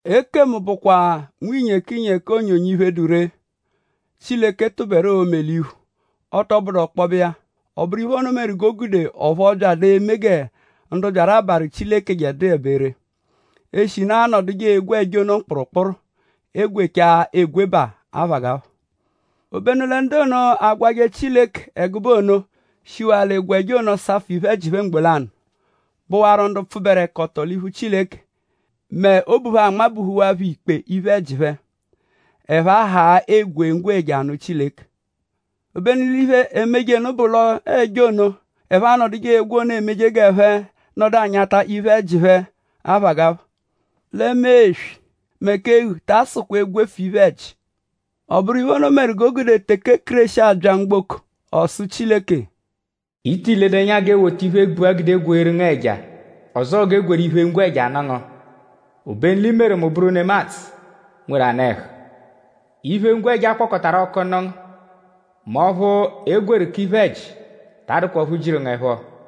Ekemu bụkwa nwinyekinyeki onyonyo iphe, dụ ree, Chileke tụberu l'oo-me l'iphu; ọ tọ bụdu ọkpobe iya. Ọ bụru iphe ono meru g'o gude ọphu ọ byadụ eme gẹ ndu byaru abarụ Chileke ẹja dụebe ree; eshinu aanọduje egwe ẹja ono mkpụrumkpuru; e -gwechaa egwebaa; aphagapha. Ọ -bụ lẹ ndu ono, agwajẹ Chileke ẹgube ono shiwaa l'egwe ẹja ono safụ iphe-ẹji phẹ mgbo lanụ; bụwaru ndu pfụberekoto l'iphu Chileke; mẹ obu phẹ anmabuhuhawaa phẹ ikpe iphe-ẹji phẹ; ẹphe ahaa egwe ngwẹja anụ Chileke. Obenu l'iphe, emeje nụ bụ l'ọo ẹja ono, ẹphe anọduje egwe ono emeje g'ẹphe nọdu anyata iphe-ẹji phẹ aphagapha. Lẹ mee eswi; mẹ k'eghu ta asụkwa egwefu iphe-ẹji. Ọ bụru iphe ono meru g'o gude; teke Kéreshi abya mgboko ọ sụ Chileke: “I ti ledu ẹnya g'e wota iphe gbua gweeru ngu ẹja; ọzoo g'e gwerụ iphe-ngwẹja nụ ngu. Obenu l'i meru mu bụru nemadzụ, nweru anụ-ẹhu. Iphe ngwẹja, akpọkotaru ọku nụ ngu; mẹ ọphu e gwerụ k'iphe-ẹji ta adụkwa ọphu jiru ngu ẹpho.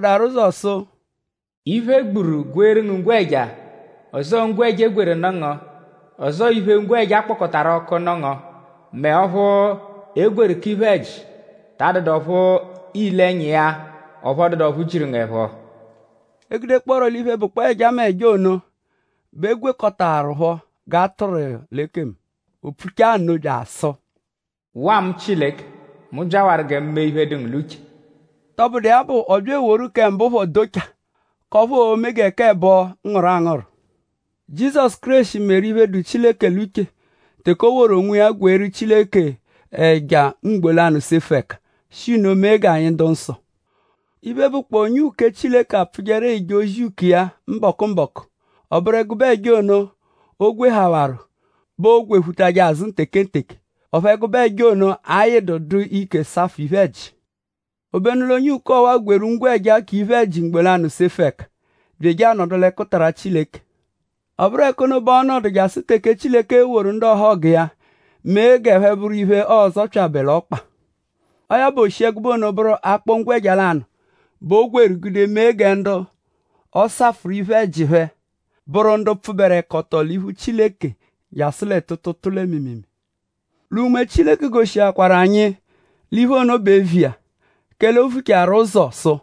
Ovukpọadaru ụzo sụ: “Iphe, e gburu gweeru ngu ngwẹja; ọzoo ngwẹja, e gwerụ nụ ngu; ọzoo iphe-ngwẹja, a kpọkotaru ọku nụ ngu; mẹ ọphu e gwerụ k'iphe-ẹji ta adụdu ọphu iile ẹnya iya; ọphu ọ dụdu ọphu jiru ngu ẹpho.” E -gudekpọoro l'iphe, bụkpoo ẹjameja ono bẹ eegwekọtaepho g'a tụru iya l'ekemu. O pfuchaa nno bya asụ: “Waa mu Chileke! Mu byawaru gẹ mu mee iphe, dụ ngu l'uche.” Tọbudu iya bụ; ọ bya eworu kẹ mbụ phọ docha k'ọphu oo-me k'ẹbo g'ọ ngụru angụru. Jizọsu Kéreshi meru iphe, dụ Chileke l'uche teke o woru onwiya gweeru Chileke ẹja mgbo lanụ sefu ẹka; shi nno mee anyi dụ nsọ. Iphe, bụkpoo onye uke Chileke apfụjeru eje ozi uke iya mbọku-mbọku; ọ bụru ẹgube ẹja, o gwehawaru bẹ oogwephuje azụ tekenteke; ọphu ẹgube ẹja ono ayịdu dụ ike safụ iphe-ẹji. Obenu l'onye uke ọwa-a gwerụ ngwẹja k'iphe-ẹji mgbo lanụ sefu ẹka; bya eje anọdu l'ẹkutara Chileke. Ọ bụru ẹka ono bẹ ọo-nọdu jasụ teke Chileke e-woru ndu ọhogu iya mee g'ẹphe bụru iphe, ọo-zọpyabe l'ọkpa. Ọo ya bụ; o shi ẹgube ono bụru akpọ ngwẹja lanụ bẹ o gwerụ gude mee gẹ ndu ọ safụru iphe-ẹji phẹ bụru ndu pfụberekoto l'iphu Chileke jasụ lẹ tuutuutuu lẹ mịimiimii. Lẹ Unme-dụ-Nsọ goshikwaruphọ anyi l'iphe ono bụ eviya; kẹle o vuchaaru ụzo sụ: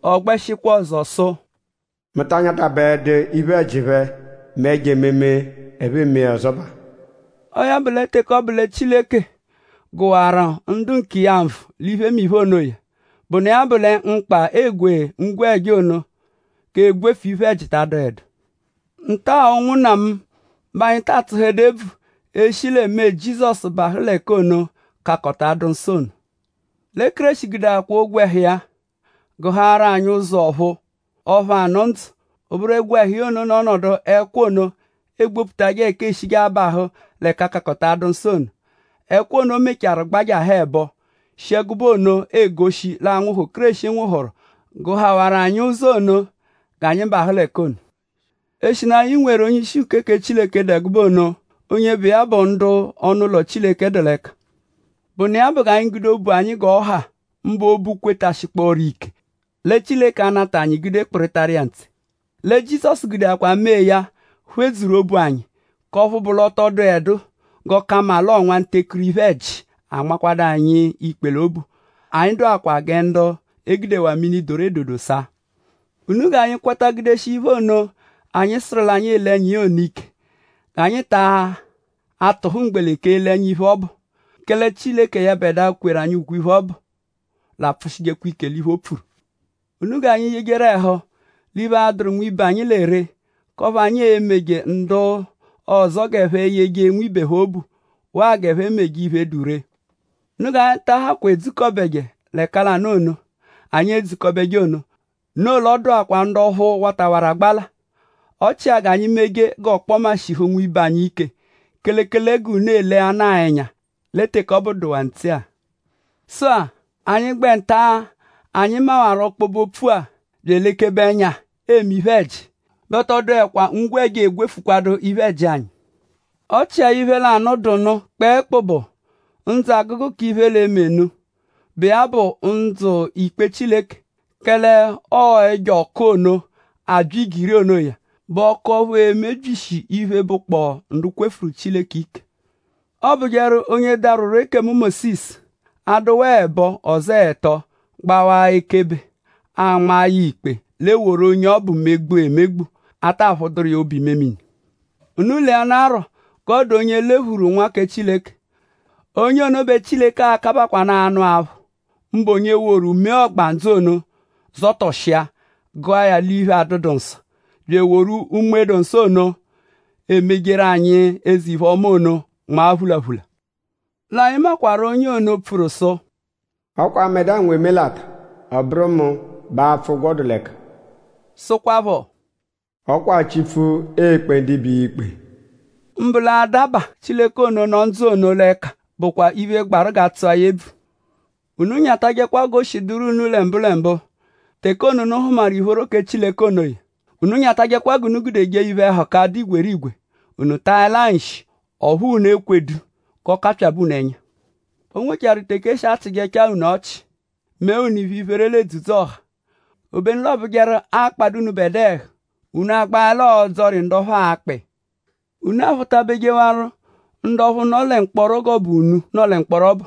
Ọ gbẹshikwa ọzo sụ: “Mu ta anyatabaẹdu iphe-ẹji phẹ mẹ ẹjo-ememe ẹphe eme ọzobaa.” Ọo ya bụ; lẹ teke ọ bụ lẹ Chileke gụwaru ndu nkiya nvụ l'iphemiphe onoya; bụnu iya bụ lẹ mkpa egwe ngwẹja ono k'egwefu iphe-ẹji ta adụedu. Nta-a; ụnwunna mu; bẹ anyi ta atsụedu ebvu eshi lẹ mee Jizọsu bahụ l'ẹka ono, Kakọta-adụ-nsọ ono. Lẹ Kéreshi gudeakwaa ogwẹhu iya gụhaaru anyi ụzo ọ̀phúú; ọphu anụ ndzụ. Ọ bụru ogwẹhu iya ono nọ ọnodu g'ẹkwa ono, egbobutajẹ ẹka eeshije abahụ l'Ẹka-kakọta-adụ-nsọ ono. Ẹkwa ono mechaarụ gbajahụ ẹbo; shi ẹgube ono egoshi l'anwụhu, Kéreshi nwụhuru gụhawaru anyi ụzo ono g'anyi bahụ l'ẹka ono. Eshinu anyi nweru onye-ishi uke kẹ Chileke dụ ẹgube ono; onye bụ iya bẹ ndu ọnu-ụlo Chileke dụ l'ẹka; bụnu iya bụ g'anyi gude obu anyi g'ọ ha; mbụ obu, kwetashikpọoru ike lẹ Chileke a-nata anyi gude kpịritaru iya ntse. Lẹ Jizọsu gudeakwa mee ya phedzuru obu anyi; k'ọphu bụ l'ọ tọ dụedu g'ọ ka mma l'ọo nwantekuru iphe-ẹji, anmakwadu anyi ikpe l'obu. Anyi dụakwapho gẹ ndu e gudewaa mini, doru edodo saa. Unu g'anyi kwata gudeshia iphe ono, anyi sụru l'anyi ele ẹnya iya ono ike; g'anyi ta tụhu mgbeleke ele ẹnya iphe ọbu; kẹle Chileke yẹbedua, kweru anyi ukwe-iphe ọbu l'apfụshijekwa ike l'iphe, o pfuru. Unu g'anyi yejeru ẹhu l'iphe, a-dụru nwibe anyi lẹ ree; k'ọphu anyi e-meje ndu ọzo g'ẹphe yeje nwibe phẹ obu; waa g'ẹphe meje iphe, dụ ree. Unu g'anyi ta ahakwa edzukọbeje l'ẹka lanụ ono, anyi edzukọbeje ono; noo l'ọ dụakwaru ndu ọphu watawarụ agbala; ọ chia g'anyi meje g'ọkpoma shihu nwibe anyi ike; kelekele g'unu elenaa ẹnya lẹ teke ọbu dụwaa ntse-a. Sụ-a; anyi -gbẹ nta-a, anyi mawaru ọkpobe-opfu-a bya elekebe ẹnya eme iphe-ẹji bẹ ọ tọ dụekwa ngwẹja, egwefukwadu iphe-ẹji anyi. Ọ chia iphe lanụ, dụ nụ kpẹekpu bụ ndzụ-agụgu k'iphe l'e-me nụ, bụ iya bụ ndzụ ikpe Chileke; kẹle ọo ẹjo ọku ono, abya igiri onoya bụ ọku ọphu e-mebyishi iphe, bụkpoo ndu kwefuru Chileke ike. Ọ bụjekwaru onye darwụru ekemu Mósisu; a -dụwaa ẹbo; ọzoo ẹto; gbawa iya ekebe; a nmaa ya ikpe; l'e woru onye ọbu megbua emegbu; a ta phụduru iya obu-imemini. Unu leanarọ g'ọo-dụ onye lephuru Nwa kẹ Chileke. Onye ono bẹ Chileke a-kabakwaanụ anụ aphụ; mbụ onye woru mee ọgbandzu ono zọtoshia gụa ya l'iphe, adụdu nsọ; bya eworu Unme-dụ-Nsọ ono, emejeru anyi eze-iphe-ọma ono nmaa phulaphula. L'anyi makwarụ onye ono, pfuru sụ: “Ọ kwa mbẹdua nwe emelata; ọ bụru mu bẹ apfụ ụgwo dụ l'ẹka.” Sụkwapho: “Ọ kwa Chipfu e-kpe ndibe iya ikpe.” Mbụ lẹ-a; adaba Chileke ono, nọ ndzụ ono l'ẹka bụkwa iphe, gbarụ g'a tsụa ya ebvu. Unu nyatajẹkwa g'o shi dụru unu lẹ mbụlembu teke ono, unu hụmaru ìphóró kẹ Chileke onoya. Unu nyatajẹkwa g'unu gude jee iphe-ẹhuka, dụ igwerigwe; unu taẹlaa nshi; ọphu unu ekwedu g'ọ kapyabẹ unu ẹnya. O nwechaaru teke e shi achịjechaa unu ọchi; mee unu iphe-iphere l'edzudzu-ọha; obenu l'ọ bụjeru akpadụ unubẹdua ẹhu; unu agbaẹla ọdzori ndu ọphu aakpa iya. Unu aphụ-tabejewaru ndu ọphu nọ lẹ mkpọro g'ọ bụ unu, nọ lẹ mkpọro ọbu.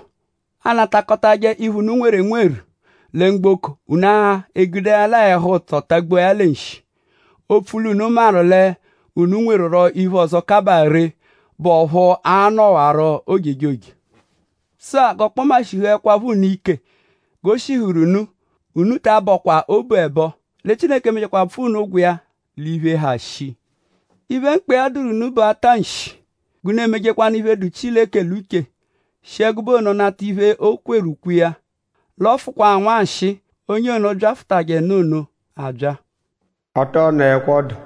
Aanakọtaje unu iphe, unu nweru enweru lẹ mgboko; unu egudeẹlaa ẹhu-ụtso tagbua ya lẹ nshi; opfu l'unu maru l'unu nwerurọ iphe ọzo, kabaa ree, bụ ọphu a-nọwaro ojejoje. Sụ-a; g'ọkpoma shihuẹkwapho unu ike g'o shihuru iya unu; unu ta abọkwa obu ẹbo; lẹ Chileke e-mechakwaa pfụa unu ụgwo iya l'iphe, ha shii. Iphe, mkpa iya dụru unu bụ ata nshi g'unu emejekwanụ iphe, dụ Chileke l'uche; shi ẹgube ono nata iphe, o kweru ukwe iya. L'ọ fụkwaa nwanshịi onye ono, byafụtajenu ono abya. Ọ tọ nọekwa ọdu.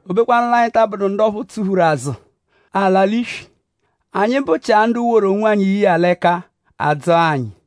O bekwanụ l'anyi ta abụdu ndu ọphu tsụlaru azụ, a-la l'iswi. Anyi bụchia ndu woru onwanyi ye iya l'ẹka; a dzọo anyi.